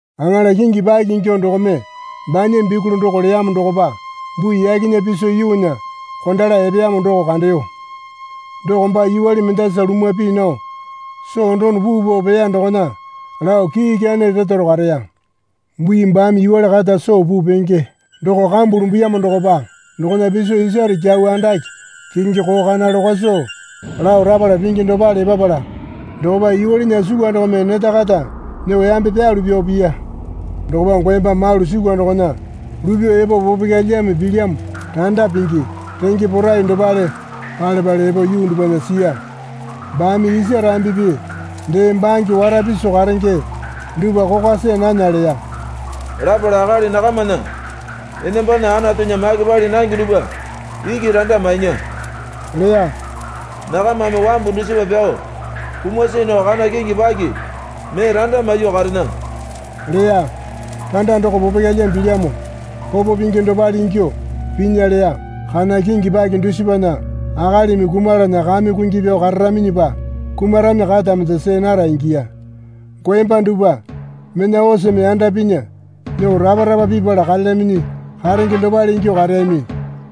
Aŋala kingi paki ingyuo dokome banya bikuli doko leyamo dokopa bui yakena piso yuunya kondala epeyamo doko kandeyo. Doko baa yuwale mendasa lumwa pii nao soo dono puu pao peya dokona lao kii ikyane retaro kareya. Bui baame yuwale kata soo puu penge doko kambu lumbuyamo dokopa dokona piso isare kyau andake kekenge koo kana lokwasu lao rapala pingi dopale epapala dokopa yuwalena sukwa dokome neta kata nyuo yambe pyalu pyao piya. Dokopa goemba malu sukwa dokona lupyuo epo popokyalyame pilyamo randa pingi renge porai dopale pale pale epo yuu dupwana siya. Baame isa rambipi dee bange wara piso karenge dupwa kokwa see nana leya. Lapala akali nakamana enambana Anatunya make pali nange dupwa iki randa mainya leya. Nakamame wambu dusipa pyao kuma see nao kana kingi paki mee randa maiyuo karena leya. Randa doko popokyalyame pilyamo popo pingi dopale ingyuo pinya leya. Kana kingi paki dusipana akalimi kumalana kame kungi pyao kararaminyipa kumarami kata mende see nara ingiya. Goemba dupwa mena oseme yanda pinya nyuo rapa rapa pipala karelyaminyi karenge dopale ingyuo kareyami.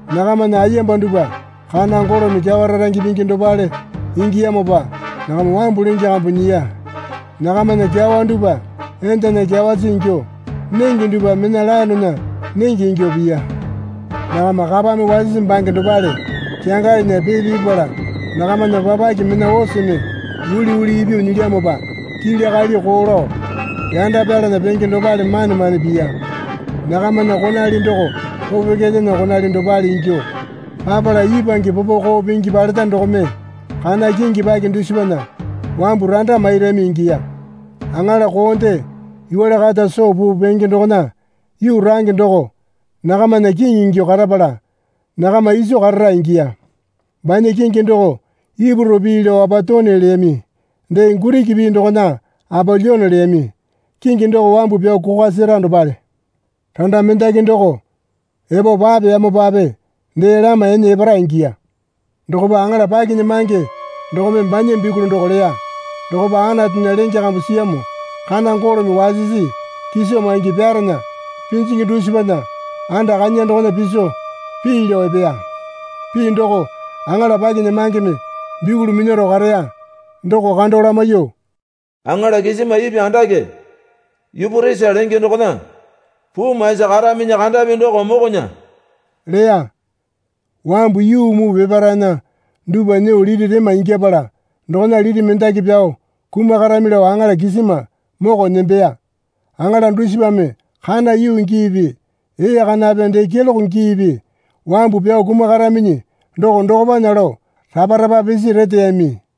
Nakamana ayemba dupwa kana golome kyawa rarange pingi dopale ingiyamopa nakama wambu lenge kambu nyiya. Nakamana kyawa dupwa endana kyawasi ingyuo nenge dupwa mena laenena nenge ingyuo piya. Nakama kapame wasisi bange dopale kyangalinya pee pipala nakamana papake mena oseme uliuli ipyuo nyilyamopa kili kali koo lao yanda pyalana penge dopale mane mane piya. Nakamana konali doko popokyalyana konali dopale ingyuo papala ipwange popo koo pingi paleta dokome kana kingi paki dusipana wambu randa mairami ingiya. Aŋala koonde yuwale kata soo puu penge dokona yuu range doko nakamana kiŋi ingyuo karapala nakama iso karara ingiya. Banya kingi doko Ipuru pii lao Apatone leyami dee Giriki pii dokona Apolyone leyami. Kingi doko wambu pyao kokwa sera dopale. Randa mendaki doko epo papeyamopape dee lama ene epara ingiya. Dokopa aŋala pakinyamange dokome banya bikuli doko leya dokopa Anatunya lenge kambu siyamo kana golome wasisi kiso maingi pyarena pinjingi dusipana anda kanya dokona piso pii lao epeya. Pii doko aŋala pakinyamangeme bikuli minyaro kareya doko kando lamaiyuo, Aŋala kisima ipwa andake Yuporisa lenge dokona puu maisi karaminyi kandapi doko mokonya leya. Wambu yuu muu peparaena dupwa nyuo liti rema ingyapala dokona liti mendaki pyao kumakarami lao aŋala kisima moko nembeya. Aŋala dusipame kana yuu giipi ee kanape dee keloke giipi wambu pyao kumakaraminyi doko dokopana lao rapa rapa pisi reteyami.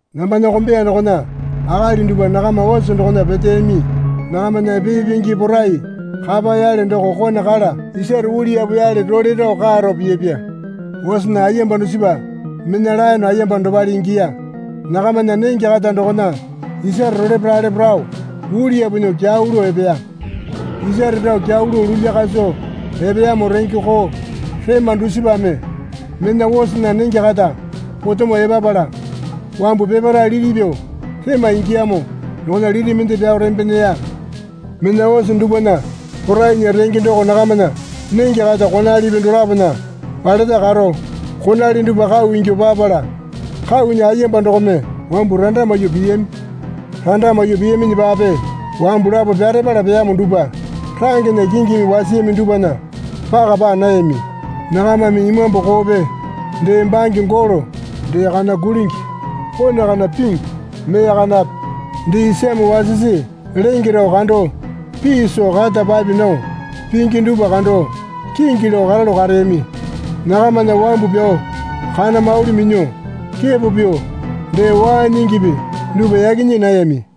Nambana kombeya dokona akali dupwa nakama ose dokona peteyami. Nakamana pee pingi porai kapa yale doko kone kala isare uliyapu yale role rao kaa rao piyapya. Osena ayemba dusipa mena laene ayemba dopale ingiya. Nakamana nenge kata dokona isare rolepo ralepo rao uliyapu nyuo kyau lao epeya. Isare rao kyau lao lulya kaso epeyamo renge koo rema dusipame mena osena nenge kata potemo epapala wambu peparae liti pyuo rema ingiyamo dokona liti mende pyao rembe neya. Mena ose dupwana porainya renge doko nakamana nenge kata konalipi dolapona paleta karo konali dupwa kau ingyuo papala kaunya ayemba dokome wambu randa maiyuo piyami. Randa maiyuo piyaminyipape wambu lapo pyarepala peyamo dupwa rangena kingimi wasiyami dupwana paka paa nayami. Nakamame imambu koope dee bange golo dee kana kulingi kone kana pingi mee kanape dee isame wasisi lenge rao kando, pii soo kata papi nao pingi dupwa kando, kingi lao karalu kareyami. Nakamana wambu pyao kana mauli minyuo, kepo pyuo, dee waa nyingipi dupwa yaki nyii nayami.